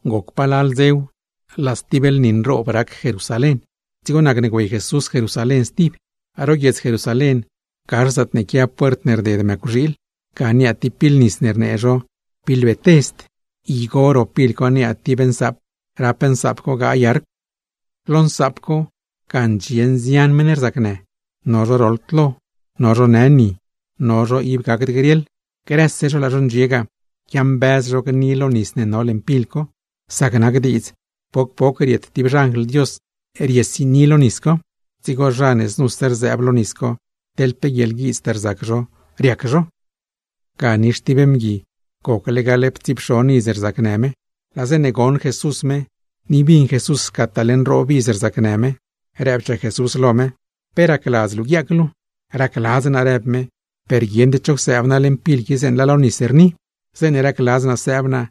Goc palal dzew, laa stib lni nroob rac Jerusalén, dzigo nacne güey Jesús Jerusalén stib. Ro guiedz Jerusalén, gax zaatne quia puert ne rded mëcwxiil, ga niaa tib pil nis rnee zho Betesd. Igo ro pil co niaa tib nsaap, rap nsaap co gaay arcw. Lo nsaap co, ga ndxie nzian meṉ rzacnë, no zho roḻd lo, no zho në ni, no zho ib gacd griaḻ [grëse zho laa zho ndxie ga quiambëz zho gni lo nis ne no leṉ pil co, sac nac diidz poc poc riet tib xanjl Dios riesini lo nis co, dzigo zha ne znuse sëëb lo nis co, teḻ pe guieḻguiidztaa rzac zho, riac zho]. Ga nix tib mgui, gocle gaḻptsiipxon iz rzacnë me. Laa zeeṉe goṉ Jesús me, ni bin Jesús scataale nroob dze rzacnë me, rëbchaa Jesús lo me: ―¿Pe racladz luu guiaac luu? ―Racladz naa ―rëb me―, per guieṉd cho csëëb naa leṉ pil qui zeeṉe laa lo nis rni. Zeeṉe racladz naa sëëb naa,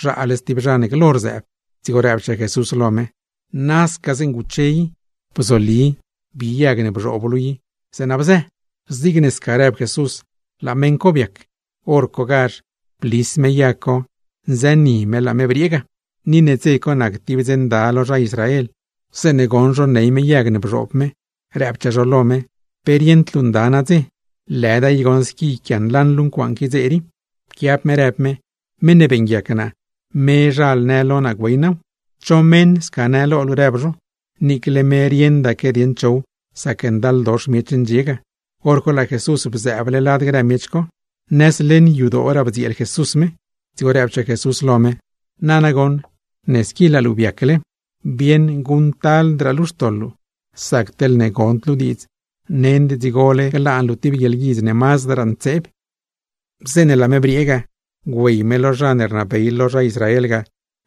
zhaale stib zha ne glo rzëëb. Dzigo rëbchaa Jesús lo me: ―¡Nasca zeeṉa guche i! ¡Bzoli, bi yag ne bzhoob luu i, zeeṉa bzë! Zigne sca rëb Jesús, laa meṉ co biac. Horcogazh blis me yag co, nzëni me laa me briee ga. Ni ne dze co nac tib dze nda lo zha Israel, zeeṉe goṉ zho ney me yag ne bzhoob me, rëbchaa zho lo me: ―¡Pe rieṉd luu nda nadze! ¡Lëda i goṉ squi yquianlaṉ luu ncuaaṉ qui dze rii! Pquiab me rëb me: ―Meṉ ne beeṉguiac naa, mezhal në lo naa, güey naaw. ―¿Cho meṉ sca në lo luu? ―rëb zho. Niicle me rieṉdaque dieṉ chow, sac ndaldox miech ne ndxie ga; hor co laa Jesús bzëëble lad grë miech co. Haxta leṉ yadooraa bdzieel Jesús me, dzigo rëbchaa Jesús lo me: ―Nana goṉ ne squi laa luu biacle, bieṉ guṉctaldraa luu xtoḻ luu. Sac teḻne gond luu diidz, nend dzigole glaan luu tib guieḻguidz ne mazdraa ntseeb. Zeeṉe laa me briee ga, güey me lo zha ne rnabey lo zha Israel ga,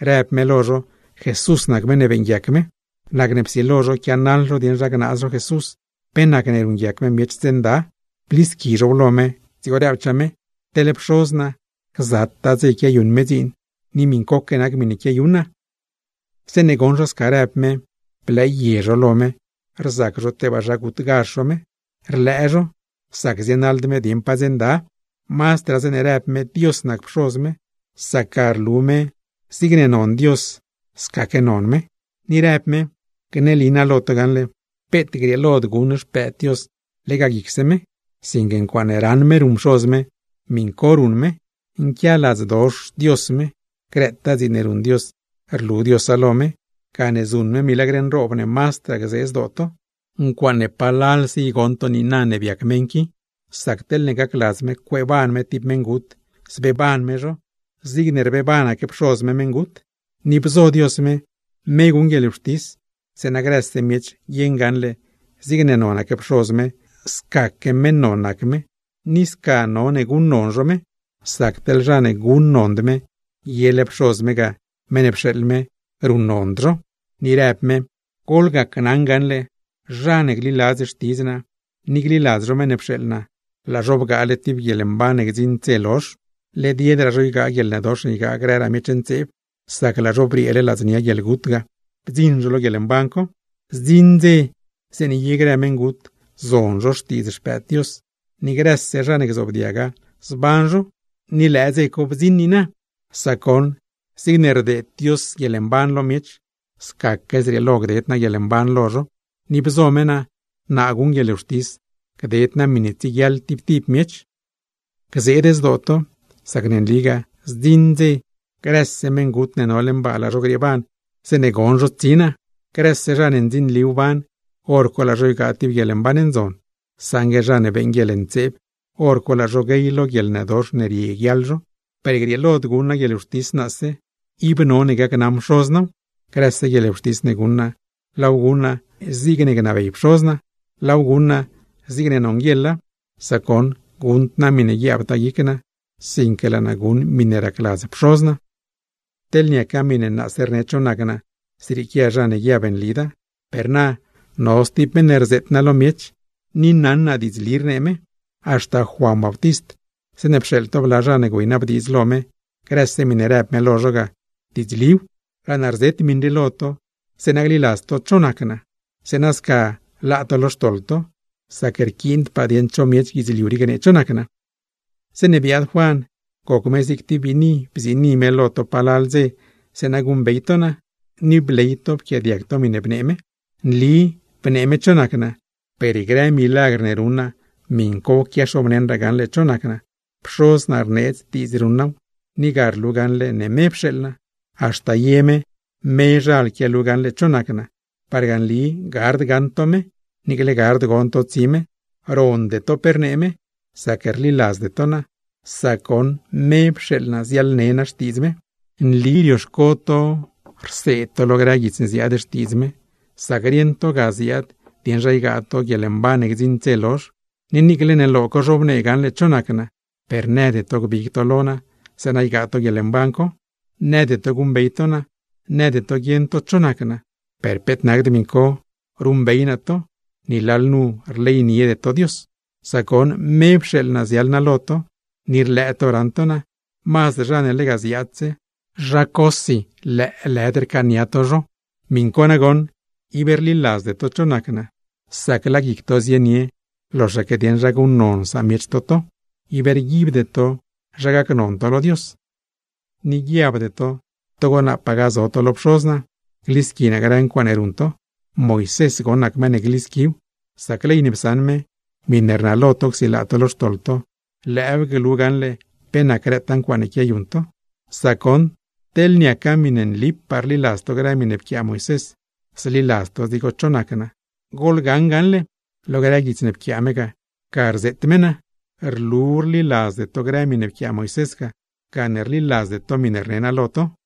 rëb me lo zho Jesús nac meṉ ne beeṉguiac me. Nacne psilo zho quianaḻ zho dieṉ zha gnaaz zho Jesús pe nacne ruṉguiac me miech dze nda. Blisqui zhow lo me, dzigo rëbchaa me: ―Teḻ Pxoz naa gzataa dze quiayuṉ me dziin; ni miṉcoque nac miṉe quiayuṉ naa. Zeeṉe goṉ zho sca rëb me, mazdraa blëë zho lo me rzac zho tebaa zha gutgazh zho me. Rlëë zho, sac zienaḻd me dieṉ pa dze nda; mazdraa zeeṉe rëb me Dios nac Pxoz me, sac ga rlu me ne lalga nac me con Dios. Ni rëb me: ―Gneli naa lo to gaṉle: peet grieelod guṉ Xpëëd Dios lega guicse me, sinque ncuaaṉe raṉ me ruṉ Pxoz me, miṉ co ruṉ me. Nquialadzdox Dios me, grëtaa dziin ne ruṉ Dios rlu Diosa lo me; gane zuṉ me milagr nroob ne mazdraa gzee zdoo to; ncuaaṉe palalse i goṉ to niina ne biac meṉ qui. Sac teḻne gacladz me cueeban me tib meṉgut, zbeeban me zho, zigne rbeebanaque Pxoz me meṉgut. Ni bzo Dios me, me guṉ guieḻwxtis, zeeṉa grëse miech guieṉ gaṉle zigne nonaque Pxoz me, scaque meṉ non nac me, ni sca none guṉnon zho me. Sac teḻ zha ne guṉnond me, yele Pxoz me ga (meṉ ne pxeeḻ me) ruṉnond zho. Ni rëb me: ―Gneli naa lo to gaṉle: Zha ne gliladz xtidz naa, ni gliladz zho meṉ ne pxeeḻ naa, laa zho bgaale tib guieḻmban ne gdziṉd dze lozh. Led yedraa zho ygaa guieḻnëdox ne ygaa grëraa miech ntseeb; sac laa zho brieele ladznia guieḻgut ga, bdziṉ zho lo guieḻmban co. Zdziṉ dze zeeṉe ye grë meṉgut, zon zho xtiidz Xpëëd Dios; ni grëse zha ne gzoobdiaga, zban zho. ¡Ni lëë dze co bdziṉ niina! Sac goṉ, zigne rdeed Dios guieḻmban lo miech, scaque zrieelo gded naa guieḻmban lo miech. Ni bzo me naa, naa guṉ guieḻwxtis, gded naa miṉe tsieguiaḻ tib tib miech. ’¡Gzeed zdoo to! Sac ne nligaa, zdziṉ dze, grëse meṉgut ne no leṉ baa, laa zho grieeban zeeṉe gon zho tsi naa. Grëse zha ne ndzinli wban, hor co laa zho ygaa tib guieḻmban ndzon; saṉgue zha ne beeṉ guieḻntseeb, hor co laa zho guey lo guieḻnëdox ne rieguiaḻ zho. ’Per grieelod guṉ naa guieḻwxtis naase, ib none gacnaṉ Pxoz naaw. Grëse guieḻwxtis ne guṉ naa, laaw guṉ naa zigne gnabey Pxoz naa, laaw guṉ naa zigne nonguieḻa, sac goṉ guṉd naa miṉe guiaabtaa guic naa, sinque laa naa guṉ miṉe racladz Pxoz naa. ’Teḻne niaca miṉe naase rne cho nac naa, zrieequia zha ne guiab nlida. Per na, no stib meṉ ne rzeet naa lo miech; ni naṉ naa diidzli rnee me. Haxta Juan Bautist, zeeṉe pxeeḻ to bla zha ne güeynabdiidz lo me, grëse miṉe rëb me lo zho ga, diidzliw. Laa naa rzet miṉ rii lo to, zeeṉa gliladz to cho nac naa, zeeṉa sca laa to lo xtoḻ to; sac rquiindpaa dieṉ cho miech guidzliu rii gnee cho nac naa. Zeeṉe biaad Juan, goc me zig tib biini bziini me lo to palal dze zeeṉa guṉbey to naa; ni bley to pquiaadiag to miṉe bnee me. Nli bnee me cho nac naa; per grë milagr ne ruṉ naa miṉ co quiaxobneṉraa gaṉle cho nac naa. Pxoz naa rneedz diidz ruṉ naaw; ni ga rlu gaṉle ne me pxeeḻ naa. Haxta ye me mezhal quialu gaṉle cho nac naa, parga nli gard gaṉ to me, niicle gard gon to tsi me. Ronde to pe rnee me, sac rliladzde to naa; sac goṉ me pxeeḻ naa ziaḻne naa xtiidz me. ’Nli rioxco to rseed to grë guits ne ziaad Xtiidz me, sac rieṉ to ga ziaad dieṉ zha ygaa to guieḻmban ne gdziṉd dze lozh. Ni niicle ne lo co zhobnee gaṉle cho nac naa, per nëde to gbig to lo naa, zeeṉa ygaa to guieḻmban co. Nëde to guṉbey to naa, nëde to guieṉ to cho nac naa, per peet nacd miṉ co; ruṉbey naa to, ni lalnu rleyniede to Dios. Sac goṉ, me pxeeḻ naa ziaḻ naa lo to, ni rlëë to raṉ to naa; mazd zha ne lega ziaadse, zha cosi lëëlëd rcaania to zho. ¡Miṉ co goṉ, ib rliladzde to cho nac naa! Sac laa guic to zienie loxaque dieṉ zha guṉnon samiech to to, ib rguibde to zha gacnon to lo Dios. Ni guiabde to togo naapaa gazo to lo Pxoz naa, glisqui naa grë ncuaaṉe ruṉ to. Moisés goṉ nac meṉ ne glisquiw; sac ley ne psaṉ me, miṉe rnalo to csilaa to lo xtoḻ to, lëëw glu gaṉle pe nac grëtaa ncuaaṉe quiayuṉ to. Sac goṉ, teḻne niaca miṉe nlipaa rliladz to grë miṉe pquiaa Moisés, zliladz to dzigo cho nac naa; goḻgaṉ gaṉle, lo grë guits ne pquiaa me, ga rzeet me naa. Rlu rliladzde to grë miṉe pquiaa Moisés ga, gane rliladzde to miṉe rne naa lo to.